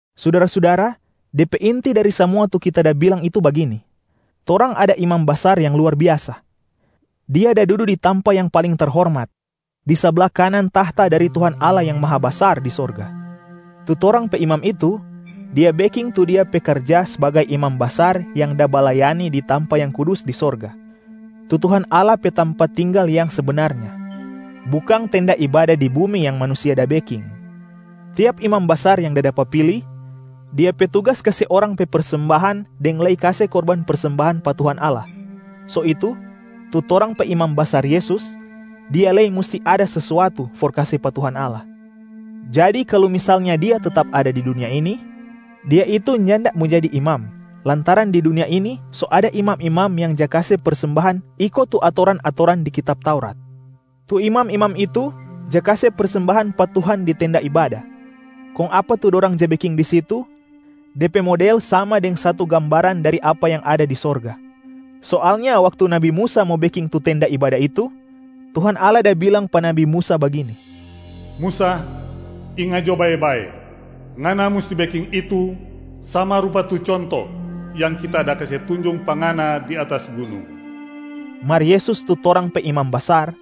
Sudara-sudara, de pe inti dari samua tu kita da bilang itu bagini: torang ada Imam Basar yang luar biasa. Dia da dudu di tampa yang paling terhormat, di sabla kanan tahta dari Tuhan Allah Yang Mahabasar di sorga. Tu torang pe Imam itu, Dia beking tu Dia pe karja sbagai Imam Basar yang da balayani di tampa yang kudus di sorga, tu Tuhan Allah pe tampa tinggal yang sebenarnyaa, bukang tenda ibada di bumi yang manusia da beking. Tiap imam basar yang da dapa pili, dia pe tugas kase orang pe persembahan deng lei kase korban persembahan pa Tuhan Allah. So itu, tu torang pe Imam Basar Yesus, Dia lei musti ada sesuatu for kase pa Tuhan Allah. Jadi kalu misalnya Dia tetap ada di dunia ini, Dia itu nyanda mo jadi Imam, lantaran di dunia ini so ada imam-imam yang ja kase persembahan iko tu atoran-atoran di kitab Taurat. Tu imam-imam itu ja kase persembahan pa Tuhan di tenda ibada, kong apa tu dorang ja beking di situ, de pe model sama deng satu gambaran dari apa yang ada di sorga. Soalnya waktu nabi Musa mo beking tu tenda ibada itu, Tuhan Allah da bilang pa nabi Musa bagini, “Musa, inga jo bae-bae! Ngana musti beking itu sama rupa tu conto yang Kita da kase tunjung pa ngana di atas gunung.” Mar Yesus tu torang pe Imam Basar,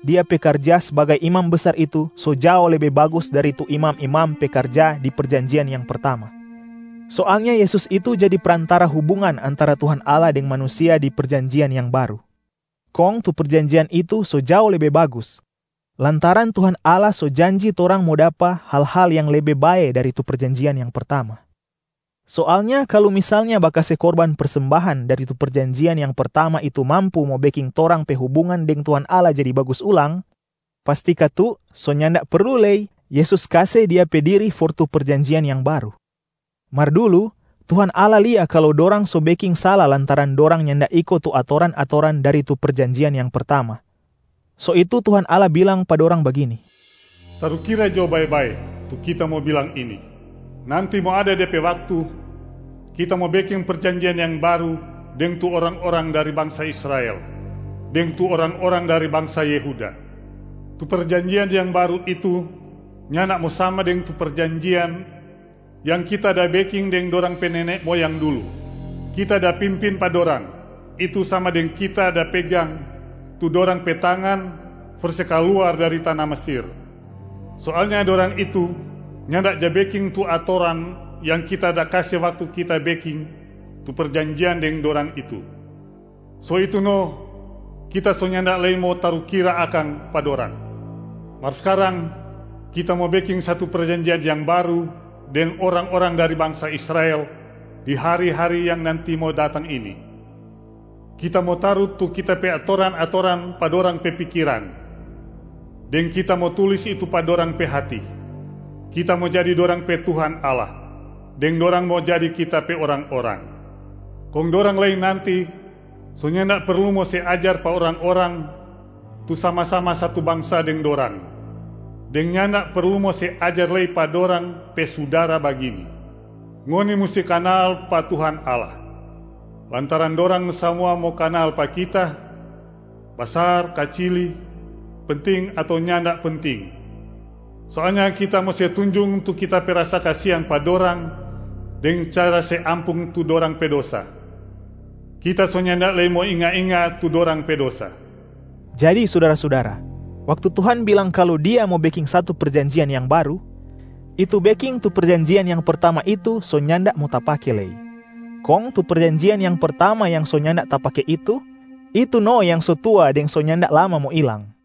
Dia pe karja sbagai Imam Basar itu so jao lebe bagus dari tu imam-imam pe karja di perjanjian yang pertama. Soalnya Yesus itu jadi prantara hubungan antara Tuhan Allah deng manusia di perjanjian yang baru, kong tu perjanjian itu so jao lebe bagus lantaran Tuhan Allah so janji torang mo dapa hal-hal yang lebe bae dari tu perjanjian yang pertama. Soalnya kalu misalnya bakase korban persembahan dari tu perjanjian yang pertama itu mampu mo beking torang pe hubungan deng Tuhan Allah jadi bagus ulang, pasti katu so nyanda perlu lei Yesus kase Dia pe diri for tu perjanjian yang baru. Mar dulu Tuhan Allah lia kalu dorang so beking sala lantaran dorang nyanda iko tu atoran-atoran dari tu perjanjian yang pertama, so itu Tuhan Allah bilang pa dorang bagini, “Tarukira jo bae-bae tu Kita mo bilang ini! Nanti mo ada de pe waktu, Kita mo beking perjanjian yang baru deng tu orang-orang dari bangsa Israel, deng tu orang-orang dari bangsa Yehuda. Tu perjanjian yang baru itu nyanda mo sama deng tu perjanjian yang Kita da beking deng dorang pe nene moyang dulu. Kita da pimpin pa dorang, itu sama deng Kita da pegang tu dorang pe tangan for se kaluar dari tana Mesir. Soalnya dorang itu nyanda ja beking tu atoran yang Kita da kase waktu Kita beking tu perjanjian deng dorang itu, so itu no Kita so nyanda lei mo tarukira akang pa dorang. Mar skarang, Kita mo beking satu perjanjian yang baru deng orang-orang dari bangsa Israel di hari-hari yang nanti mo datang ini. Kita mo taru tu Kita pe atoran-atoran pa dorang pe pikiran, deng Kita mo tulis itu pa dorang pe hati. Kita mo jadi dorang pe Tuhan Allah, deng dorang mo jadi Kita pe orang-orang. Kong dorang lei nanti so nyanda perlu mo se ajar pa orang-orang tu sama-sama satu bangsa deng dorang, deng nyanda perlu mo se ajar lei pa dorang pe sudara bagini, ‘Ngoni musti kanal pa Tuhan Allah’, lantaran dorang samua mo kanal pa Kita, basar kacili, penting ato nyanda penting. Soalnya Kita mo se tunjung tu Kita pe rasa kasiang pa dorang deng cara se ampung tu dorang pe dosa, Kita so nyanda lei mo inga-inga tu dorang pe dosa.” Jadi sudara-sudara, waktu Tuhan bilang kalu Dia mo beking satu perjanjian yang baru, itu beking tu perjanjian yang pertama itu so nyanda mo tapake lei. Kong tu perjanjian yang pertama yang so nyanda tapake itu, itu no yang so tua deng so nyanda lama mo ilang.